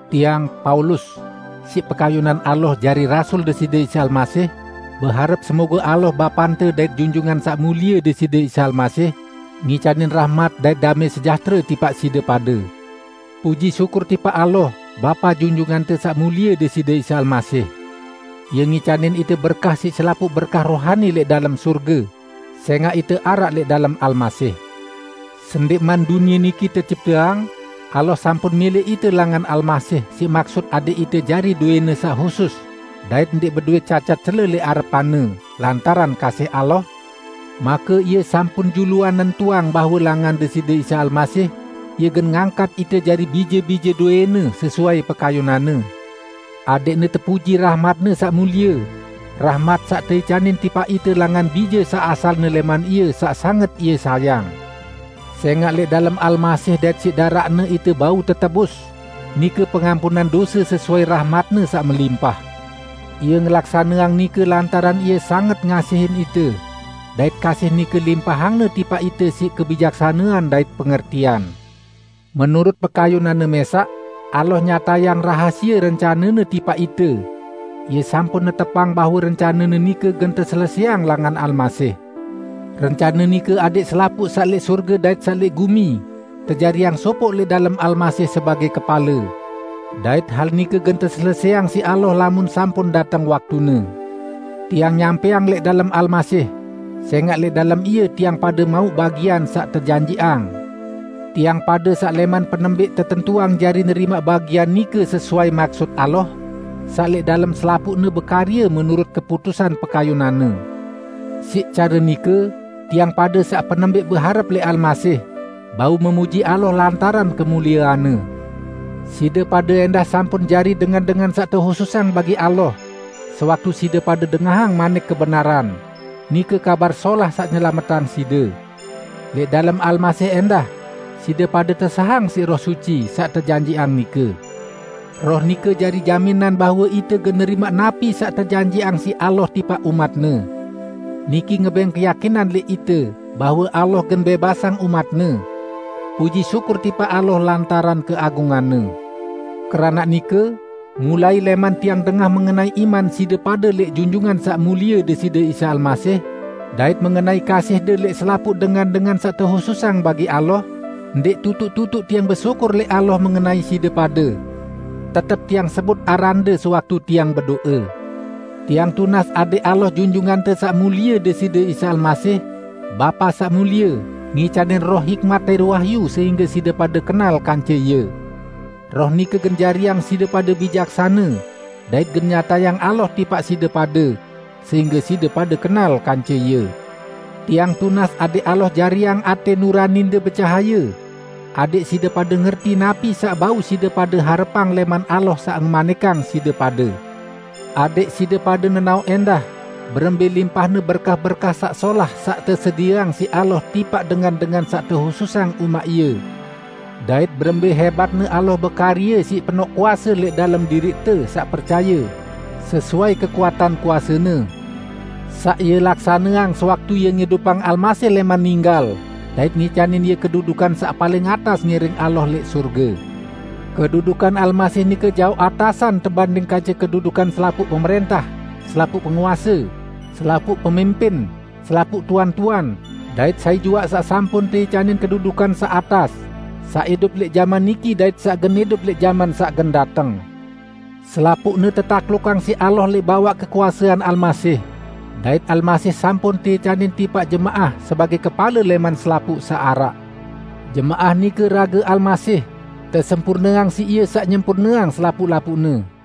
Tiang, Paulus, siq pekayunan Allah jari rasul Deside Isa Almasih, beharep semoge Allah Bapante dait Junjungan Saq Mulie Deside Isa Almasih ngicanin rahmat dait damẽ sejahtere tipaq side pade. Puji syukur tipaq Allah, Bapa Junjungante Saq Mulie Deside Isa Almasih! Ie ngicanin ite berkah siq selapuq berkah rohani lẽq dalem sorge, sẽngaq ite araq lẽq dalem Almasih. Sendẽqman dunie niki tecipteang, Allah sampun milẽq ite langan Almasih siq maksut adẽq ite jari dowẽ-Ne saq husus dait ndẽq bedowẽ cacat cele lẽq arepan-Ne. Lantaran kasih Allah, make Ie sampun juluan nentuang bahwe langan Deside Isa Almasih, Ie gen ngangkat ite jari bije-bije dowẽ-Ne sesuai pekayunan-Ne, adẽqne tepuji rahmat-Ne saq mulie, rahmat saq teicanin tipaq ite langan Bije saq asalne lẽman Ie saq sanget Ie sayang. Sẽngaq lẽq dalem Almasih dait siq daraq-Ne ite bau tetebus, nike pengampunan dose sesuai rahmat-Ne saq melimpah. Ie ngelaksaneang nike lantaran Ie sanget ngasihin ite, dait kasih nike limpahang-Ne tipaq ite siq kebijaksanean dait pengertian. Menurut pekayunan-Ne mẽsaq, Allah nyatayang rahasie rencane-Ne tipaq ite; Ie sampun netepang bahwe rencane-Ne nike gen teselesẽang langan Almasih. Rencane nike adẽq selapuq saq lẽq sorge dait saq lẽq gumi, tejariang sopoq lẽq dalem Almasih sebagẽ kepale. Dait hal nike gen teselesẽang siq Allah lamun sampun dateng waktune. Tiang nyampẽang "lẽq dalem Almasih", sẽngaq lẽq dalem Ie tiang pade mauq bagian saq tejanjiqang -- tiang pade saq lẽman penembẽq tetentuang jari nerimaq bagian nike sesuai maksut Allah, saq lẽq dalem selapuqne bekarye menurut keputusan pekayunan-Ne. Siq care nike, tiang pade saq penembẽq beharep lẽq Almasih, bau memuji Allah lantaran kemuliean-Ne! Side pade ẽndah sampun jari dengan-dengan saq tehususang bagi Allah sewaktu side pade dengahang manik kebenaran, nike Kabar Solah saq nyelametang side. Lẽq dalem Almasih ẽndah, side pade tesahang siq Roh Suci, saq tejanjiqang nike. Roh nike jari jaminan bahwe ite gen nerimaq napi saq tejanjiqang siq Allah tipaq umat-Ne. Niki ngebẽng keyakinan lẽq ite bahwe Allah gen bẽbasang umat-Ne. Puji syukur tipaq Allah lantaran keagungan-Ne! Keranaq nike, mulai lẽman tiang dengah mengenai iman side pade lẽq Junjungan Saq Mulie Deside Isa Almasih, dait mengenai kasihde lẽq selapuq dengan-dengan saq tehususang bagi Allah, ndẽq tutuq-tutuq tiang besyukur lẽq Allah mengenai side pade. Tetep tiang sebut arande sewaktu tiang bedo'e. Tiang tunas adẽq Allah Junjungante Saq Mulie Deside Isa Almasih, Bapa Saq Mulie, ngicanin Roh hikmat dait wahyu sehingge side pade kenal kance Ie. Roh nike gen jariang side pade bijaksane, dait gen nyatayang Allah tipaq side pade sehingge side pade kenal kance Ie. Tiang tunas adẽq Allah jariang atẽ nuraninde becahaye; adẽq side pade ngerti napi saq bau side pade harepang lẽman Allah saq ngemanikang side pade. Adẽq side pade nenaoq ẽndah berembẽ limpahne berkah-berkah saq solah saq tesedieang siq Allah tipaq dengan-dengan saq tehususang umaq Ie; dait berembẽ hẽbatne Allah bekarye siq penoq kuase lẽq dalem diriqte saq percaye, sesuai kekuatan kuase-Ne, saq Ie laksaneang sewaktu Ie ngidupang Almasih lẽman ninggal dait ngicanin Ie kedudukan saq paling atas ngiring Allah lẽq sorge. Kedudukan Almasih nike jaoq atasan tebanding kance kedudukan selapuq pemrẽntah, selapuq penguase, selapuq pemimpin, selapuq tuan-tuan, dait sai juaq saq sampun teicanin kedudukan saq atas; saq idup lẽq jaman niki dait saq gen idup lẽq jaman saq gen dateng. Selapuqne tetaklukang siq Allah lẽq bawaq kekuasean Almasih, dait Almasih sampun teicanin tipaq jemaah sebagẽ kepale lẽman selapuq saq araq. Jemaah nike rage Almasih, tesempurneang siq Ie saq nyempurneang selapuq-lapuqne.